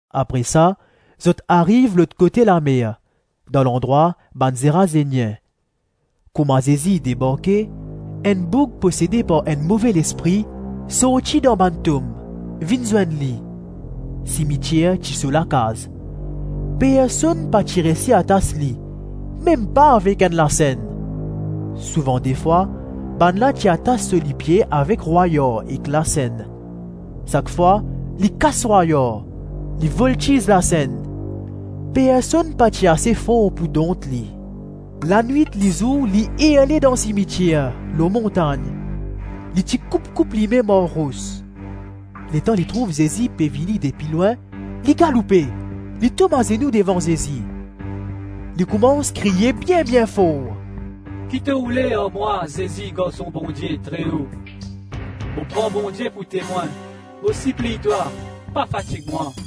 Apre sa, zot ariv lot kote lamer, dan landrwa bann Zerazenien. Kouma Zezi debarke, enn boug posede par enn move lespri, sorti dan bann tom, vinn zwenn li. Simitier ti so lakaz. Personn pa ti reysi atas li, mem pa avek enn lasenn. Souvan defwa, bannla ti atas so lipie avek rwayar ek lasenn; sak fwa li kas rwayar, li voltiz lasenn. Personn pa ti ase for pou dont li. Lanwit-lizour li irle dan simitier, lor montagn. Li ti koup-koup limem ar ros. Letan li trouv Zezi pe vini depi lwin, li galoupe, li tom azenou devan Zezi. Li koumans kriye bien-bien for, “Ki to oule ar mwa, Zezi Garson Bondie Treo? Mo pran Bondie pou temwin, mo sipliy twa, pa fatig mwa.”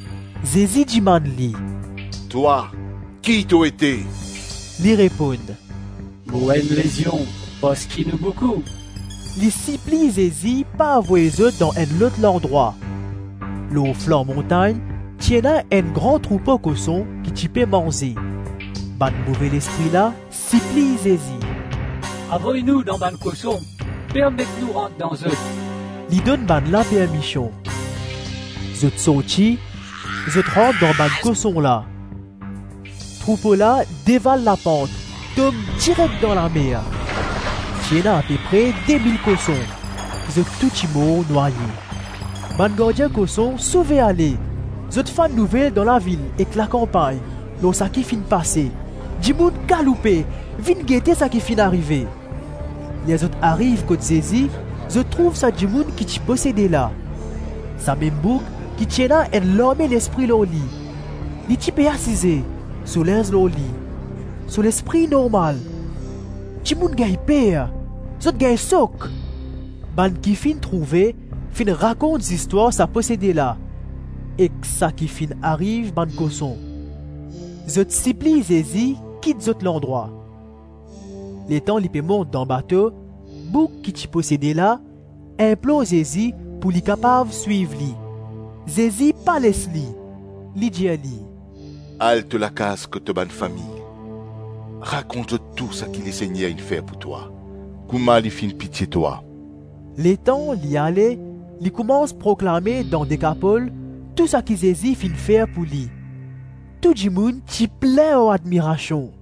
Zezi dimann li, “Twa ki to ete?” Li reponn, “Mo enn lezion parski nou boukou.” Li sipliy Zezi pa avoy zot dan enn lot landrwa. Lor flan montagn, ti ena enn gran troupo koson ki ti pe manze. Bann move lespri la sipliy Zezi, “Avoy nou dan bann koson, permet nou rant dan zot.” Li donn bannla permision. Zot sorti, zot rant dan bann koson la. Troupo la deval lapant, tom direk dan lamer. Ti ena apepre demil koson, zot tou ti mor nwaye. Bann gardien koson sove-ale; zot fann nouvel dan lavil ek lakanpagn lor saki finn pase. Dimoun galoupe, vinn gete saki finn arive. Ler zot ariv kot Zezi, zot trouv sa dimoun ki ti posede la. Samem boug ki ti ena enn larme lespri lor li; li ti pe asize, so linz lor li, so lespri normal; dimoun gagn per, zot gagn sok. Bann ki finn trouve, finn rakont zistwar sa posede la ek saki finn ariv bann koson. Zot sipliy Zezi kit zot landrwa. Letan li pe mont dan bato, boug ki ti posede la, inplor Zezi pou li kapav swiv li. Zezi pa les li; li dir li, “Al to lakaz kot to bann fami; rakont zot tou saki Lesegner inn fer pou twa, kouma li finn pitie twa.” Letan li ale, li koumans proklame dan Dekapol tou saki Zezi finn fer pou li. Tou dimoun ti plin ar admirasion.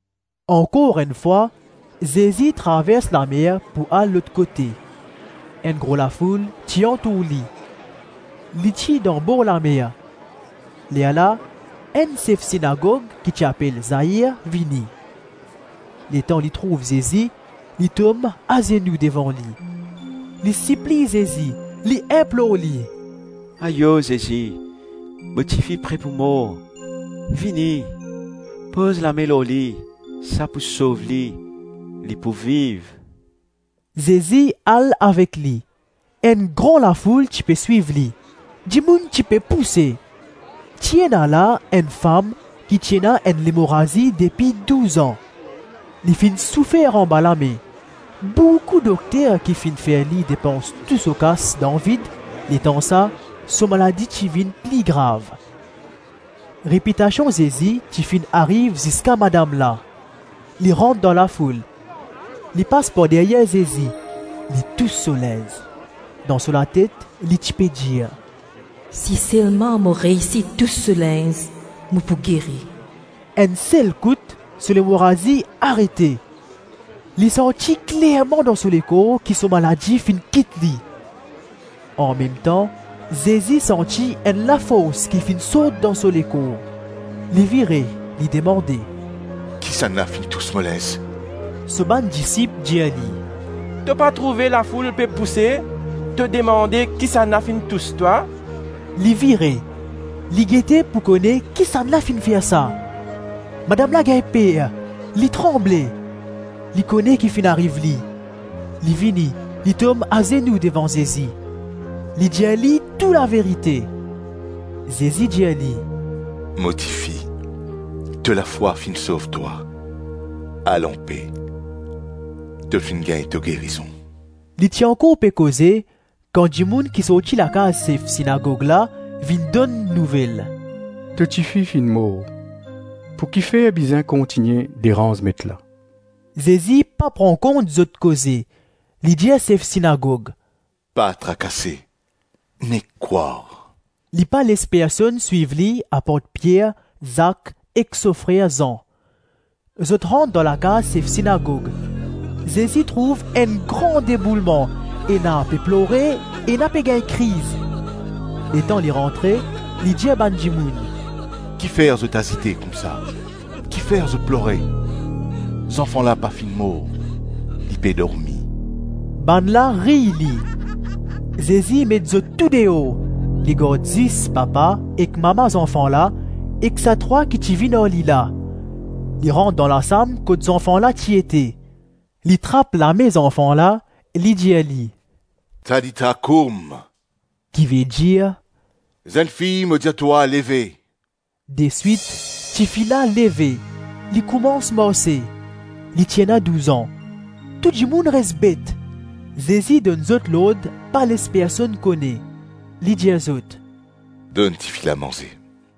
Ankor enn fwa, Zezi travers lamer pou al lot kote, enn gro lafoul ti antour li. Li ti dan borlamer. Lerla enn sef sinagog ki ti apel Zair vini. Letan li trouv Zezi, li tom azenou devan li. Li sipliy Zezi, li inplor li, “Ayo, Zezi, mo tifi pre pou mor; vini, poz lame lor li, sa pou sov li, li pou viv.” Zezi al avek li. Enn gran lafoul ti pe swiv li. Dimoun ti pe pouse. Ti ena la enn fam ki ti ena enn lemorazi depi douz-an. Li finn soufer anba lame boukou dokter ki finn fer li depans tou so kas dan vid; letansa so maladi ti vinn pli grav. Repitasion Zezi ti finn ariv ziska madam la. Li rant dan lafoul, li pas par deryer Zezi, li tous so linz. Dan so latet li ti pe dir, “Si selman mo reysi tous so linz, mo pou geri.” Enn sel kout, so lemorazi arete. Li santi klerman dan so lekor ki so maladi finn kit li. Anmemtan Zezi santi enn lafors ki finn sort dan so lekor. Li vire, li demande, “Kisannla finn tous mo linz?” So bann disip dir li, “To pa trouve lafoul pe pouse, to demande, kisannla finn tous twa?” Li vire, li gete pou kone kisannla finn fer sa? Madam la gagn per, li tranble; li kone ki finn ariv li; li vini, li tom azenou devan Zezi, li dir li tou laverite. Zezi dir li, “Mo tifi, to lafwa finn sov twa; al anpe; to finn gagn to gerizon.” Li ti ankor pe koze, kan dimoun ki sorti lakaz sef sinagog la vinn donn nouvel, “To tifi finn mor; pou kifer bizin kontigne deranz Met la?” Zezi pa pran kont zot koze; li dir sef sinagog, “Pa trakase, nek krwar.” Li pa les personn swiv li apart Pier, Zak ek so frer Zan. Zot rant dan lakaz sef sinagog; Zezi trouv enn gran deboulman, ena pe plore, ena pe gagn kriz. Letan li rantre, li dir bann dimoun, “Kifer zot azite koumsa? Kifer zot plore? Zanfan la pa finn mor, li pe dormi.” Bannla riy li. Zezi met zot tou deor; li gard zis papa ek mama zanfan la ek sa trwa ki ti vinn ar li la; li rant dan lasam kot zanfan la ti ete. Li trap lame zanfan la, li dir li, “Talita koum,” - kivedir, “Zennfi, mo dir twa, leve.” Deswit tifi la leve, li koumans marse (li ti ena douz-an). Tou dimoun res bet. Zezi donn zot lord pa les personn kone. Li dir zot, “Donn tifi la manze.”